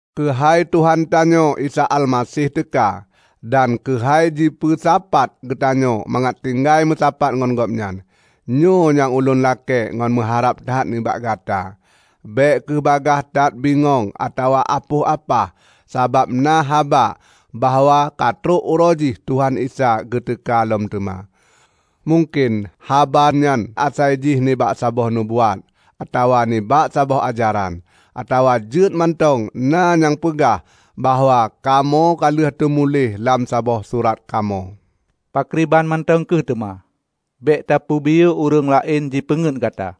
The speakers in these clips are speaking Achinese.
Keuhai Tuhan tanyoe Isa Almaseh teuka, dan keuhai jipeusapat geutanyoe mangat tinggai meusapat ngon Gobnyan, nyoe nyang ulôn lakée ngon meuharab that nibak gata: Bék kheueh bagaih that bingong atawa apoh apah sabab na haba bahwa katrok uroe jih Tuhan Isa geuteuka lom teuma. Mungken haba nyan asai jih nibak saboh nubuat, atawa nibak saboh ajaran; atawa jeuet mantong na nyang peugah bahwa kamoe kaleuh teumuléh lam saboh surat kamoe. Pakriban mantong kheuh teuma, bék tapeubiyeu ureuëng laén jipeungét gata.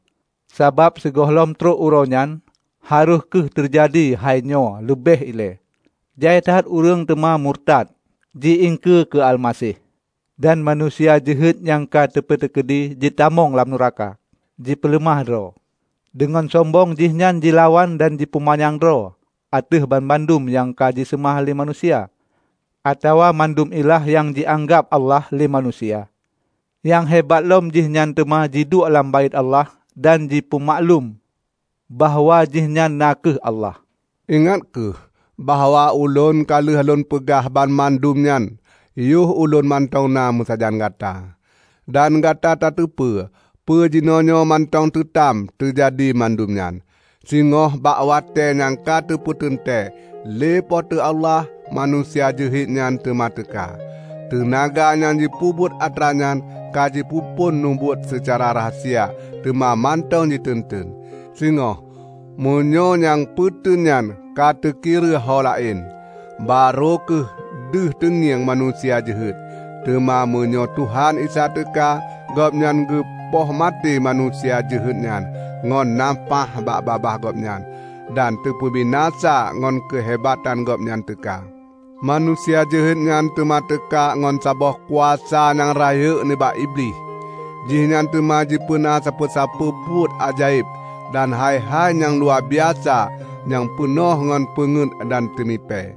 Sabab sigohlom trok Uroe nyan, harôh kheueh teujadi hainyoe leubeh ilée: Jai that ureuëng teuma murutat, ji iengkeue keu Almaseh; dan Manusia Jeuhet nyang ka teupeuteukeudi jitamong lam nuraka, jipeuleumah droe. Deungon sombong jihnyan jilawan dan jipeumanyang droe ateueh banmandum nyang jiseumah lé manusia, atawa mandum ilah nyang jianggab Allah lé manusia. Nyang hebat lom jihnyan teuma jiduek lam Baét Allah dan jipeumaklum bahwa jihnyan na kheueh Allah. Ingat kheueh bahwa ulôn ka lheueh lôn peugah banmandum nyan yoh ulôn mantong na meusajan gata. Dan gata tateupeue peue jinoenyoe mantong teutam teujadi mandum nyan. Singoh bak watée nyang ka teupeuteuntée lé Po teu Allah, Manusia Jeuhet nyan teuma teuka. Teunaga nyang jipeubuet atranyan ka jipeuphon mubuet seucara rahsia, teuma mantong jiteun-teun. Singoh meunyoe nyang peuteun nyan ka teukireuh ho laén, barô kheueh deuh teungieng Manusia Jeuhet. Teuma meunyoe Tuhan Isa teuka, Gobnyan geupoh maté Manusia Jeuhet nyan ngon nafáh bak babah Gobnyan, dan teupeubinasa ngon keuhebatan Gobnyan teuka. Manusia Jeuhet nyan teuma teuka ngon saboh kuasa nyang rayeuk nibak Iblih. Jihnyan teuma jipeuna sapeue-sapeue buet ajaéb dan hai-hai nyang luwabiasa nyang peunoh ngon peungét dan teumipée.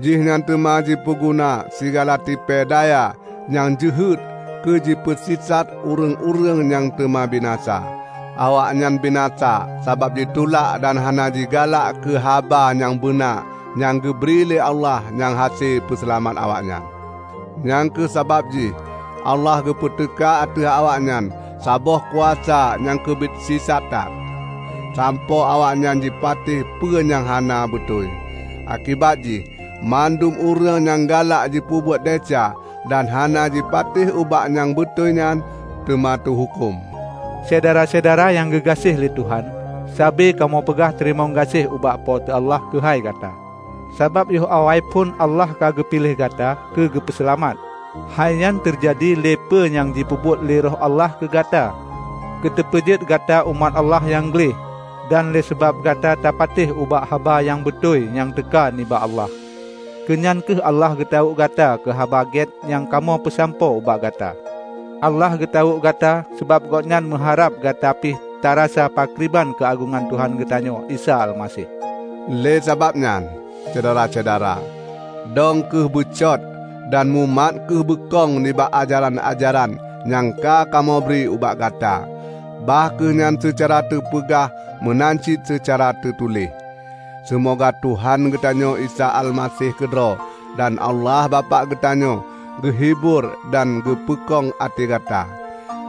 Jihnyan teuma jipeuguna sigala tipée daya nyang jeuhet keujipeusisat ureuëng-ureuëng nyang teuma binasa. Awaknyan binasa sabab jitulak dan hana jigalak keu haba nyang beuna nyang geubri lé Allah nyang hase peuseulamat awaknyan. Nyang kheueh sabab jih Allah geupeuteuka ateueh awaknyan saboh kuasa nyang keubiet sisat that, sampoe awaknyan jipatéh peue nyang hana beutôi. Akibat jih, mandum ureuëng nyang galak jipeubuet desya dan hana jipatéh ubak nyang beutôi nyan, teuma teuhuköm. Syedara-syedara nyang geugaséh lé Tuhan! Sabe kamoe peugah teurimong gaséh ubak Po teu Allah keuhai gata, sabab yoh awaiphon Allah ka geupiléh gata keu geupeuseulamat. Hai nyan teujadi lé peue nyang jipeubuet lé Roh Allah keugata keu teupeujeuet gata umat Allah nyang gleh dan lé sabab gata tapatéh ubak haba nyang beutôi nyang teuka nibak Allah. Keu nyan kheueh Allah geutawök gata keu Haba Gét nyang kamoe peusampoe ubak gata. Allah geutawök gata, sabab Gobnyan meuharab gata pih tarasa pakriban keuagongan Tuhan geutanyoe Isa Almaseh. Lé sabab nyan, Syedara-syedara, dong kheueh beucot dan mumat kheueh beukong nibak ajaran-ajaran nyang ka kamoe bri ubak gata, bah kheueh nyan seucara teupeugah meunan cit seucara teutuléh. Seumoga Tuhan geutanyoe Isa Almaseh keudroe, dan Allah Bapak geutanyoe geuhibur dan geupeukong até gata,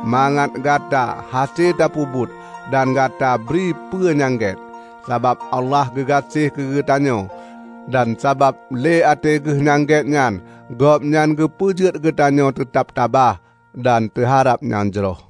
mangat gata hase tapeubuet dan gata bri peue nyang gét. Sabab Allah geugaséh keugeutanyoe, dan sabab lé até Geuh nyang gét nyan Gobnyan geupeujeuet geutanyoe teutab tabah, dan teuharab nyang jroh.